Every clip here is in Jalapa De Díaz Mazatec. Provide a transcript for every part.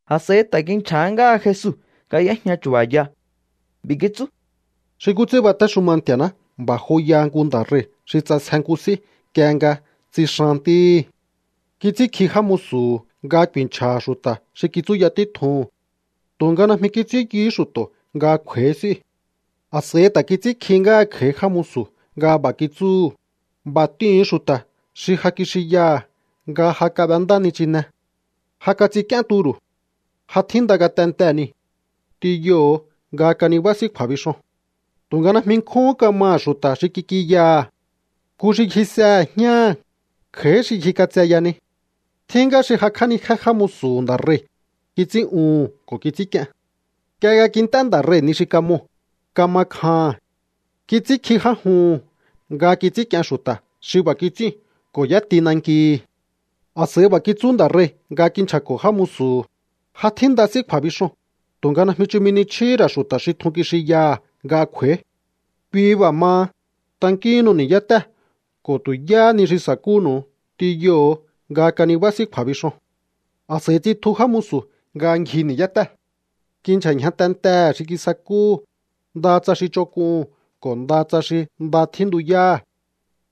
A̱s'a̱i ta̱ kinchja̱há ngáha Jesu nga y'éjña chu̱ba̱ya. B'i̱ kitsú: —Xi nkú ts'ín batéxuma Nti̱a̱ná b'a̱ joyaha nku nda̱ rei̱ xi ts'asje nku s'í nk'ie nga tsixan ntíhi̱. Kits'ínkji já musu̱hu̱ nga ku̱i̱nchja̱ha̱ xu̱ta̱ xi kitsúya títjuhu̱n. Tu̱nga najmi kits'ín yuhú xu̱to̱ nga kj'u̱a̱í s'íu̱. A̱s'a̱i ta̱ kits'ínkjihí ngáha kj'a̱í já musu̱ nga b'a̱ kitsúhu̱: “B'a̱ t'ihu̱un xu̱ta̱ xi ja kixinyaha̱ nga ja kab'endá nichinee̱. Ja kats'ink'íén turu̱. Ja tjínda ngatentee̱ niu̱. T'inyoho̱o nga kanibá s'í kju̱a̱bixoo̱n.” ’Tu̱nga najmi nkjún kamaha̱ xu̱ta̱ xi kik'inyaha̱. Nku xi ngjisehe̱ jñáha̱, kj'a̱í xi ngjik'atseya ni. Tjín ngá xi jakj'ánijé já musu̱hu̱ nda̱ rei̱, kits'ín'uhu̱n ko̱ kits'ínk'ien. Nk'ie nga kint'é nda̱ rei̱ ni xi kamoo̱, kama kjaha̱n. Kits'ínkji já juhu̱n nga kits'ínk'ien xu̱ta̱ xi b'a̱ kits'íu̱n ko̱ y'éti nankihi̱. ’A̱s'a̱i b'a̱ kitsú nda̱ rei̱ nga kinchja̱ko̱ já musu̱hu̱: “Ja tjínda s'í kju̱a̱bixoo̱n, tu̱nga najmi chumi ni chjíhí ra̱ xu̱ta̱ xi tjun kixinyaha̱ nga kj'u̱a̱í. Kui b'a̱ maha, tankíhinnu ni̱yátée̱ ko̱ tu̱ yáhá ni xi sa̱kúnu̱u t'inyoho̱o nga kanibá s'í kju̱a̱bixoo̱n.” A̱s'a̱i tsitju já musu̱ nga ngji ni̱yátée̱. Kinchja̱ ñja tentehe̱ xi kisakúhu̱, ndaha tsa xi ch'onk'uhu̱n ko̱ ndaha tsa xi nda tjíntuyáha̱.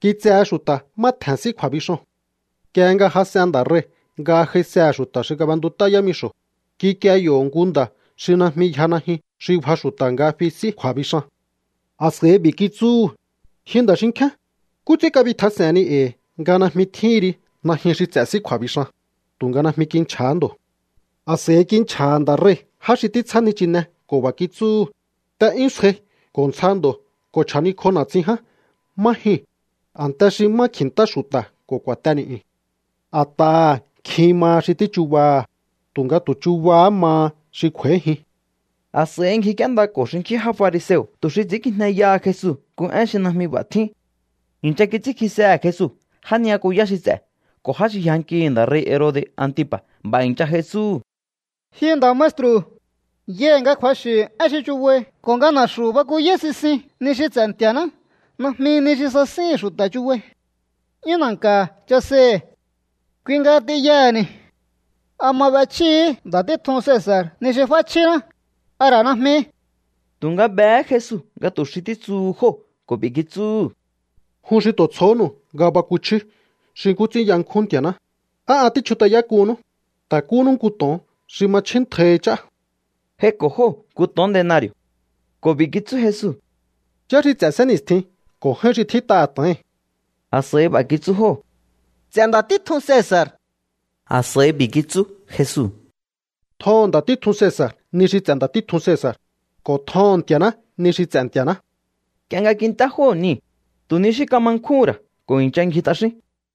Kitsehe xu̱ta̱ má tje̱n s'í kju̱a̱bixoo̱n. ’Nk'ie nga jas'en nda̱ rei̱ nga j'aisehe̱ xu̱ta̱ xi kab'entut'á yámixo̱, kikie yo̱ nku nda̱ xi najmi yja najyun xi bja xu̱ta̱ nga fi s'í kju̱a̱bixan. A̱s'a̱i b'i̱ kitsúhu̱: “Ji nda̱ xinkjíán, ¿nkú ts'ín kabitjas'e̱henni e̱i̱ nga najmi tjíhin ri najyun xi ts'e̱ s'í kju̱a̱bixan?” Tu̱nga najmi kinchja̱há ndo̱. A̱s'a̱i kinchja̱ha̱ nda̱ rei̱ já xi títsjá nichinee̱ ko̱ b'a̱ kitsúhu̱: “T'e'yún sjai ko̱ ntsja ndo̱ ko̱ chja̱nikj'o na̱tsin ján má jyuu̱n, a̱nte xi má kji̱ntá xu̱ta̱ ko̱ ku̱a̱te ni̱'yu̱n.” A̱t'aha̱ nkjin maha xi tíchubaha̱, tu̱nga tu̱ chubahá maha xi kj'u̱a̱íjin. A̱s'a̱i ngjik'íéndako̱ xinkjín já fariseo̱ tu̱ xi ts'i̱ínkijneyaha Jesu nku én xi najmi b'a̱ tjín. I̱ncha kits'ínkjisehe̱ Jesu já ni'yakuyá xi ts'e̱ ko̱ já xi yjankihi̱ nda̱ rei̱ Herode̱ Antipa̱. B'a̱ i̱ncha j'ai tsúhu̱: —Ji nda̱ maestru̱, yai̱ nga kju̱axi̱ én xi chubai ko̱ nga na̱xu̱ bakuyáí sisin ni xi ts'e̱ Nti̱a̱ná. Najmi ni xi sasíhi̱n xu̱ta̱ chubai. 'Yún na̱nka̱ chaseihi̱. Kui nga t'inyaha̱ni̱. ¿A ma b'echjíhi̱í nda̱ títjun Cesa̱r ni xi f'áchjíná, a ra̱ najmi? Tu̱nga behé Jesu nga tu̱ xi títsuhu jóo̱ ko̱ b'i̱ kitsúhu̱: —¡Jun xi tu̱ tsjohónu̱u nga bakuchjíú xi nkú ts'ín yankjún Nti̱a̱ná! ¿Á an tíchjut'ayák'uhunnú? Ta̱kúnnú nku to̱on xi ma chjíntjaihi ch'á. J'aiko̱ jóo̱ nku to̱on denari̱o̱. Ko̱ b'i̱ kitsú Jesu: —¿Yá xi ts'e̱ sénni̱stjii̱n ko̱ j'áín xi tjít'aha̱ to̱oi̱n? A̱s'a̱i b'a̱ kitsú jóo̱: —Ts'e̱ nda̱ títjun Cesa̱r. A̱s'a̱i b'i̱ kitsú Jesu: —Tjoho̱on nda̱ títjun Cesa̱r ni xi ts'e̱ nda̱ títjun Cesa̱r, ko̱ tjoho̱on Nti̱a̱ná ni xi ts'e̱ Nti̱a̱ná. Nk'ie nga kint'é jóo̱ niu̱, tu̱ ni xí kama nkjúhún ra̱ ko̱ i̱ncha ngji t'axín.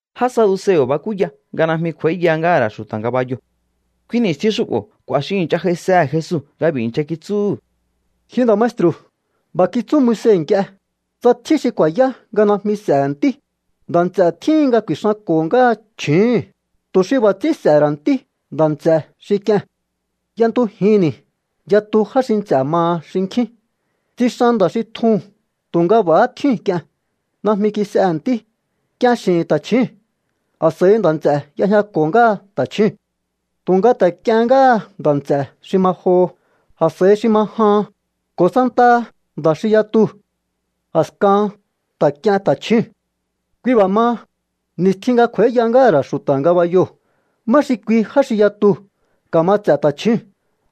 Já saduseo̱ bakúya nga najmi kj'u̱a̱íya ngáha̱ ra̱ xu̱ta̱ ngabayoo̱. Kui ni̱stjin xu'bo̱ k'u̱a̱ xi i̱ncha j'aisehe̱ Jesu nga b'i̱ i̱ncha kitsúhu̱: —Ji nda̱ maestru̱, b'a̱ kitsú Moise nk'ie: “Tsa tjín xi ku̱a̱yá nga najmi s'e̱he̱ ntí, nda̱ nts'e̱ tjíhin nga ku̱i̱xanko̱ ngáha chju̱úhu̱n, tu̱ xi b'a̱ ts'ín s'e̱he̱ ra̱ ntí nda̱ nts'e̱ xi k'ie̱n.” Y'entujinni̱ yatu já xi nts'e̱ maha xinkjín. Tsixan nda̱ xi tjuu̱n tu̱nga b'a̱há tjíu̱n k'ien. Najmi kis'ehe̱ ntí. K'ien x'i̱hi̱n tachjúu̱n. A̱s'a̱i nda̱ nts'e̱ y'ejñako̱ ngáha ta̱chjúu̱n. Tu̱nga ta̱ k'iehén ngáha nda̱ nts'e̱ xi ma joho, a̱s'a̱i xi ma jahan, ko̱ santaha nda̱ xi yatuu̱. A̱skahan ta̱ k'ien ta̱chjúu̱n. ’Kui b'a̱ maha, ni̱stjin nga kj'u̱a̱íya ngáha̱ ra̱ xu̱ta̱ ngabayoo̱, ¿má xi kui já xi yatuu̱ ka̱ma ts'e̱ ta̱chjúu̱n,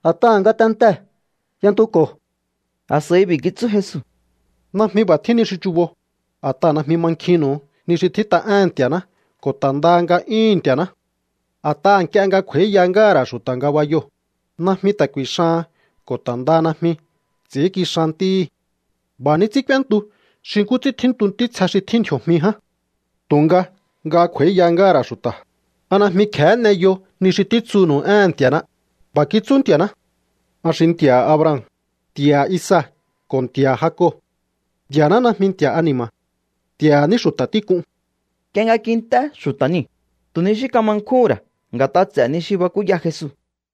a̱t'aha̱ ngatentee̱ y'entuko̱? A̱s'a̱i b'i̱ kitsú Jesu: —Najmi b'a̱ tjín ni xi chubo, a̱t'aha̱ najmi mankjinnu̱u ni xi tjít'a éhe̱n Nti̱a̱ná ko̱ ta̱ ndaha nga'yúhu̱n Nti̱a̱ná. A̱t'aha̱ nk'ie nga kj'u̱a̱íya ngáha̱ ra̱ xu̱ta̱ ngabayoo̱, najmi ta̱ ku̱i̱xahan ko̱ ta̱ ndaha najmi ts'i̱ínkixan ntíhí. B'a̱ ní ts'ín k'úéntu xi nkú ts'ín tjíntu ntítsje xi tjín ndji̱o̱jmi ján. Tu̱nga nga kj'u̱a̱íya ngáha̱ ra̱ xu̱ta̱, ¿a najmi kje̱hé n'eyo ni xi títsunu̱u éhe̱n Nti̱a̱ná? B'a̱ kitsú Nti̱a̱ná: “An xi Nti̱a̱ha̱ Abraham, Nti̱a̱ha̱ Isaac ko̱ Nti̱a̱ha̱ Jacob.” Nti̱a̱ná najmi Nti̱a̱ha̱ ani̱ma̱. Nti̱a̱ha̱ ní xu̱ta̱ tík'un. Nk'ie nga kint'é xu̱ta̱ niu̱, tu̱ ni xí kama nkjúhún ra̱ nga̱t'a ts'e̱ ni xi bakúya Jesu.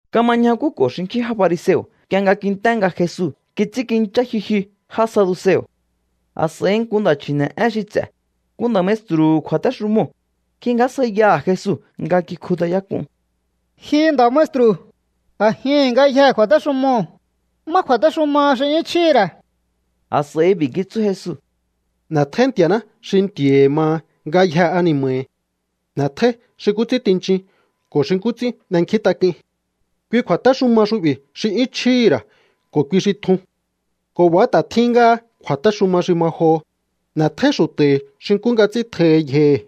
Kama ñjakúko̱ xinkjín já fariseo̱ nk'ie nga kint'é nga Jesu kits'ínkinchá jyujyu já saduseo̱. A̱s'a̱i nku nda̱ chji̱ne̱'én xi ts'e̱, nku nda̱ maestru̱hu̱ kju̱a̱téxumoo̱, kingjásjaiyaha̱ Jesu nga kikjut'ayák'un: —Ji nda̱ maestru̱, a̱jihi̱n ngayjee̱ kju̱a̱téxumoo̱, ¿má kju̱a̱téxumaha xi 'yún chjíhi̱ ra̱? A̱s'a̱i b'i̱ kitsú Jesu: —“N'e̱tjóí Nti̱a̱ná xi Nti̱a̱hi̱ maha ngayjee̱ ani̱ma̱hi̱. N'e̱tjóí xi nkú ts'ín tinchin ko̱ xi nkú ts'ín n'enkjíntak'uin.” Kui kju̱a̱téxuma xu'bi̱ xi 'yún chjíhi̱ ra̱ ko̱ kui xi tjun. Ko̱ b'a̱há ta̱ tjín ngáha kju̱a̱téxuma xi ma joho: “N'e̱tjóí xu̱ta̱hi̱ xi nkú nga ts'ín tjohi yjohi̱.”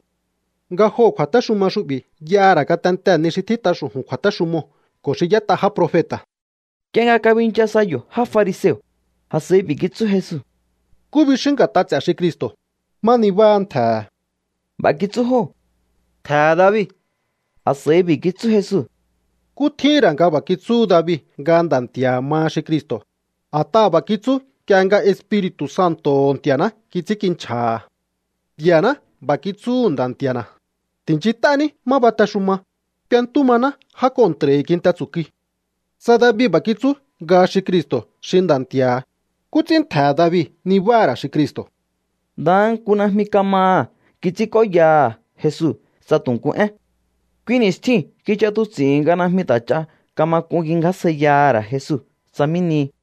Nga joo̱ kju̱a̱téxuma xu'bi̱ y'aha̱ ra̱ ngatentee̱ ni xi tjít'a xu̱ju̱n kju̱a̱téxumoo̱ ko̱ xi y'ét'a já profeta̱. Nk'ie nga kabincha sa yo̱ já fariseo̱, a̱s'a̱i b'i̱ kitsú Jesu: —¿Nkú bixíún nga̱t'a ts'e̱ xi Cristo̱? ¿Má nibáha̱ ntje̱he̱? B'a̱ kitsú jóo̱: —Ntje̱he̱ David. A̱s'a̱i b'i̱ kitsú Jesu: —¿Nkú tjíhi̱n ra̱ nga b'a̱ kitsúhu David nga Nda̱ Nti̱a̱ha̱ maha xi Cristo̱? A̱t'aha̱ b'a̱ kitsú nk'ie nga Espiri̱tu̱ Santo̱ho̱ Nti̱a̱ná kits'ínkinchja̱ha̱: Nti̱a̱ná b'a̱ kitsúhu̱ Nda̱ Nti̱a̱na̱: “Ti̱nchint'ání má batexuma, k'uentú maná já kontra̱hi̱ kinte tsu̱kui.” Tsa David b'a̱ kitsú nga xi Cristo̱ xi Nda̱ Nti̱a̱ha̱, ¿nkú ts'ín ntje̱he̱ David nibáha̱ ra̱ xi Cristo̱? Ndaha nku najmi kamaha̱ kits'ínk'óyaha̱ Jesu tsa tu̱ nku én. Kui ni̱stjiu̱n kich'atuts'i̱hi̱n nga najmi ta̱ ch'a kama k'un kingjásjaiyaha̱ ra̱ Jesu tsa mí nihi.